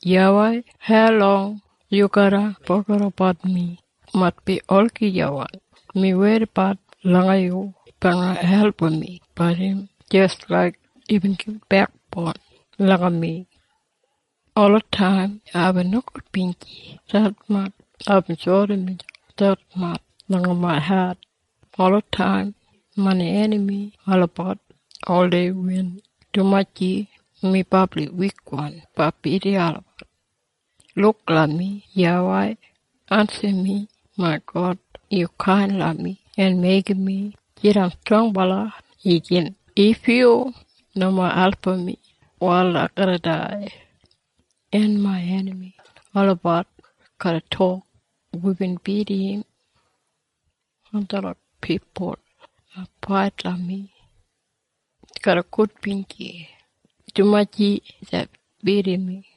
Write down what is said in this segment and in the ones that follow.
YAWEI, haulong yu garra fogedabat mi? Maitbi olagijawan. Mi weidabat langa yu blanga album mi, bat im jis laik yubin gibit bekboun langa mi. Olataim aibin nogudbinji detmatj, en aibin sori miselp detmatj langa main hat. En olataim main enami olabat oldei win, dumaji mi brabli wikwan blanga bidim olabat. Luk langa mi, YAWEI. Ensim mi, main God! Yu kain langa mi en meigim mi jidan strongbala igin! If yu nomo album mi wal ai garra dai, En main enami olabat garra tok, “Wibin bidim im!” En detlot pipul hu fait langa mi garra gudbinji, dumaji deibin bidim mi.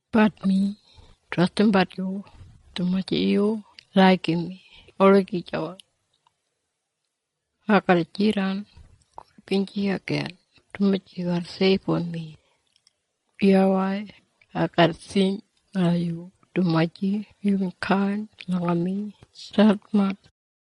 Bat mi trastimbat yu dumaji yu laigim mi olagijawan. Ai garra jidan gudbinji igin, dumaji yu garra seibum mi. YAWEI ai garra sing langa yu, dumaji yubin kain langa mi detmatj.